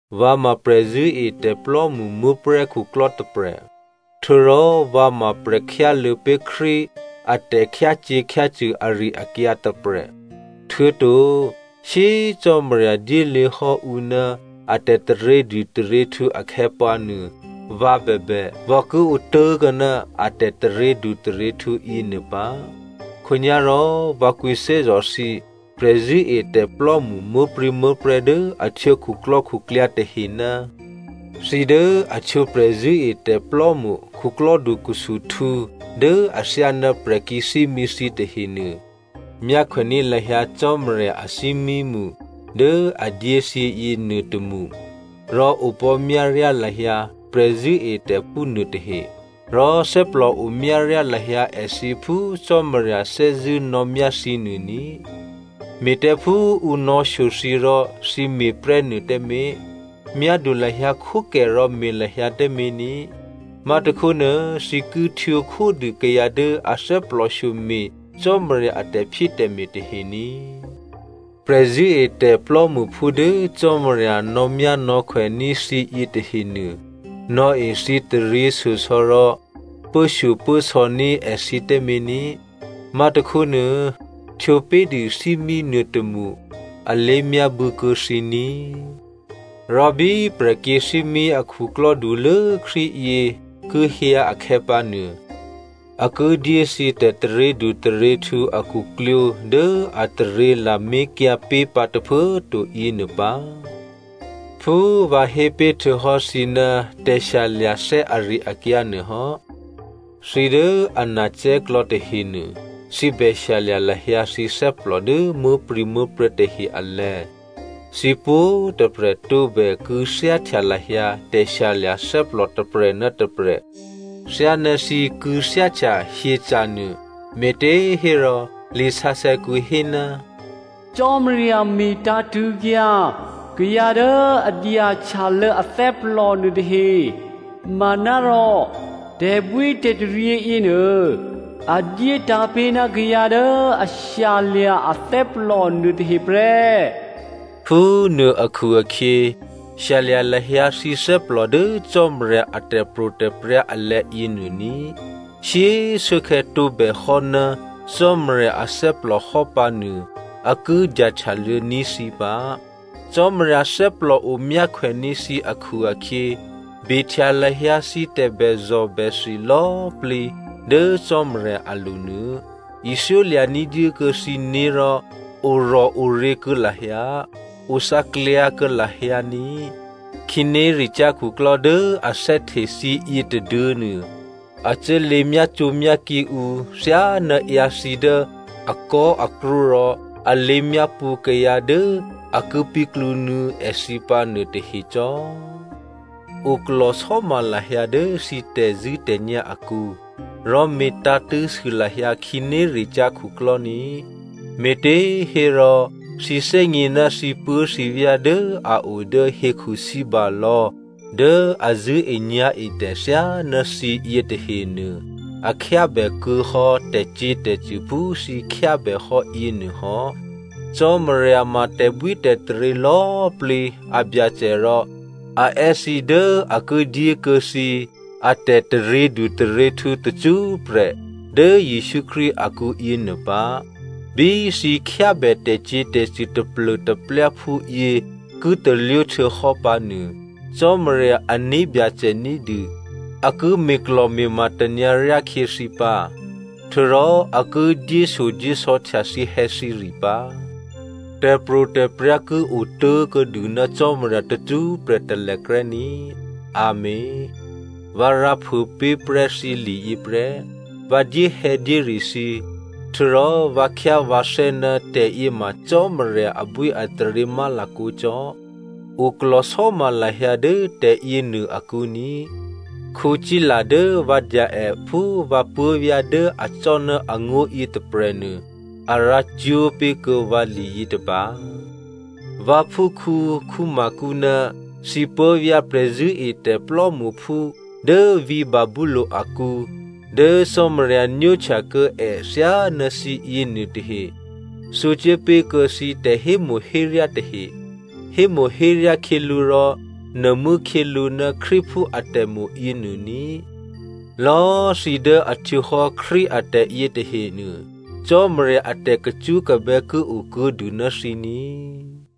Vǎ ma prè̤zṳ̂́etè̤plò́mṳ muố̤prè̤́ khuklò́ tôprè̤, htuô̌rò vǎ ma prè̤khyáluô̌ pé̤ Krístu a tè̤khyácyě̤khyácṳ̂ ari-akyǎ tôprè̤. Htuô̌to shyé꤮ Cò́marya dyéluô̌ hò́ ǔ ná a tè̤taryědu taryěhtǔ akhè̌pǎnuô, vǎ bèbè, vǎ ki otố̤kuô̌ ná a tè̤taryědu taryěhtǔ yěnuô pǎ. Khǒnyá̤rò vǎ kwǐthè́zò̤ thǐ prè̤zṳ̂́etè̤plò́mṳ muố̤prû̌muố̤prè̤́ dố a htwǒ khuklò́khuklyǎ tahe, thǐ dố a htwǒ prè̤zṳ̂́etè̤plò́mṳ khuklò́dukhusuhtǔ dố athyáná prè̤kyě̤thímí thǐ tahenuô, myákhwèní̤ lahyǎ Cò́marya athímímṳ dố a dyé thǐ yěnuôtômṳ, rò opò̤́myáryá lahyǎ prè̤zṳ̂́etè̤phú nuôtahe, rò thè́plò o myáryá lahyǎ èthǐ phú Cò́marya thè́zṳ̂́ nò̌myá thǐ nuô ní꤮. Me̤ tǎ phú ǔ nò̌shyo thǐ rò thǐ me̤prè́nuô tǎmé̤. Myádu lahyǎ khwókè rò me̤ lahyǎ tǎmé̤ ní꤮. Má̤tôkhónuô, thǐ ki htwǒ khódû kayǎ dố a thè́plòshyo me̤ Cò́marya a tè̤phyétè̤me̤ tahe ní꤮. Prè̤zṳ̂́etè̤ plò́mṳphú dố Cò́marya nò̌myánò̌khwèní̤ thǐ yětahenuô, nò̌e thǐ taryěshyosò̌ rò pốshyopốsò̌ ní̤ èthǐ tǎmé̤ ní꤮. Má̤tôkhónuô, htwǒpé̤dû thímí nuôtômṳ alé̤myábû̌kuô̌ thǐ ní꤮. Rò bí prè̤kyě̤thímí akhuklò́ dulố Krístu yě ki hyǎ akhè̌pǎnuô, a ki dyé thǐ tè̤taryědu taryěhtǔ akhuklwǒ̤ dố ataryě lamé̤kyǎ pé̤pǎ tôphuố꤮ to yěnuô pǎ. Phú vǎ hé pé̤ htuô̌hò́ thǐ ná tè̤shyalya̤thè́ ari-akyǎ nuô hò́, thǐ dố a nacè̤́klò̌ tahenuô, thǐ bè shyalya̤ lahyǎ thǐ thè́plò dố muố̤prû̌muố̤prè̤́ tahe alè̤̌. Thǐ pwǒ̤꤮ tôprè̤ tǒbè kû̌thyáhtya lahyǎ tè̤shyalya̤ thè́plò tôprè̤ ná tôprè̤ thyáná thǐ kû̌thyáhtya hyeca̤nuô, me̤těhérò, lisǎsè̌kǔ hé, “Cò́marya me̤tǎ̤tṳ̂̌kyǎ kayǎ dố a dyahtyalô̌ athè́plò nuôtahe manárò tè̤bwítè̤taryě yěnuô, a dyé tǎ̤pé̤ ná kayǎ dố a shyalya̤ athè́plò nuôtahe prè́.” Phúnuô akhu-akhyě, shyalya̤ lahyǎ thǐ thè́plò dố Cò́marya a tè̤pro̤tè̤prya̤ alè̤̌ yěnuô ní꤮. Shyé꤮ shuốkhè̌ tǒbèhò́ ná Cò́marya athè́plò hò́ pǎnuô, a ki dyahtyalô̌ní̤ thǐ pǎ. Cò́marya thè́plòo myákhwèní̤ thǐ akhu-akhyě, behtya lahyǎ thǐ tè̤bèzò̤bèthi lò̌꤮ plǐ dố Cò́marya alo̤ nuô. Ithyólya̤ ní̤dyé kuô̌ thǐné̤ rò orò̤oryě̤ kuô̌ lahyǎ, othǎklyǎ kuô̌ lahyǎ ní꤮. Khǐnéricyá̤ khuklò́ dố a thè́hte thǐ yě tôduô̌nuô a cuốlě myácǒmyákǐ ǔ thyáná ǎyǎthǐ dố akò̤́akrṳ́ rò a lěmyápṳ̌ kayǎ dố a ki píklǔnuô̌ èthǐ pǎ nuôtahe cò́. Oklò̤sò́ma lahyǎ dố thǐ tè̤zṳ̂́tè̤nyá̤ akǔ. Rò me̤tǎ̤tṳ̂̌sû lahyǎ khǐnéricyá̤ khuklò́ ní꤮, me̤těhérò, thǐ thè́gně ná thǐpuố̤thǐvyá̤ dố a o dố hekhu sǐbalò̌ dố a zṳ̂́enyá̤etè̤ thyáná thǐ yětahenuô, a khyábèkuô̌ hò́ tè̤cyě̤tè̤cṳ̂ phú thǐ khyábè hò́ yěnuô hò́. Cò́marya ma tè̤bwítè̤taryě lò̌꤮ plǐ a Byacè rò a è́ thǐ dố a ki dyékuô̌ thǐ atè̤taryědu taryěhtǔ tacṳ́prè̤ dố Jesǔ Krístu akǔ yěnuô pǎ. Bí thǐ khyábè tè̤cyě̤tè̤cṳ̂ taplô̤taplyáphú yě ki talwó htuô̌hò́ pǎnuô, Cò́marya ané̤byacè ní̤dû a ki me̤klò̤me̤ma tanyǎ ryákhyě thǐ pǎ, htuô̌rò a ki dyéshyodyésò̌htya thǐhè̌thǐre pǎ. Tè̤pro̤tè̤prya̤ ki otố̤kuô̌dû ná Cò́marya tacṳ́prè̤ talèkrè́ ní꤮. Amèn. Vǎ rǎphuô pé̤ prè́ thǐ liyě prè́. Vǎ dyéhè̌dyére thǐ, htuô̌rò vǎ khyá vǎthè́ ná tè̤yěma Cò́marya abwíataryě má̤lakǒ cò́. Oklò̤sò́ma lahyǎ dố tè̤yěnuô akǔ ní꤮. Sila dố vǎ dya è phú vǎ puố̤vyá̤ dố acò́ ná angó̤yě tôprè̤nuô, a rǎcwó̤ pé̤kuô̌ vǎ liyětôba. Vǎphúkhǔ Marko ná thǐ puố̤vyá̤ prè̤zṳ̂́etè̤ plò́mṳphú dố vǐ̤ Babylonia akǔ dố Cò́marya nwóhtya kuô̌ è thyáná thǐ yěnuôtahe, thǔ cuốpé̤ kuô̌ thǐ tè̤hémo̤héryá tahe. Hémo̤héryá khyělǔ rò nuô̤mû́ khyělǔ ná Krístuphú atè̤mo̤ yěnuô ní꤮. Lò̌꤮ thǐ dố a htwǒhò́ Krístu atè̤ yětahenuô, Cò́marya a tè̤kacṳ́kabè́ ki o kuô̌dû ná thǐ ní꤮.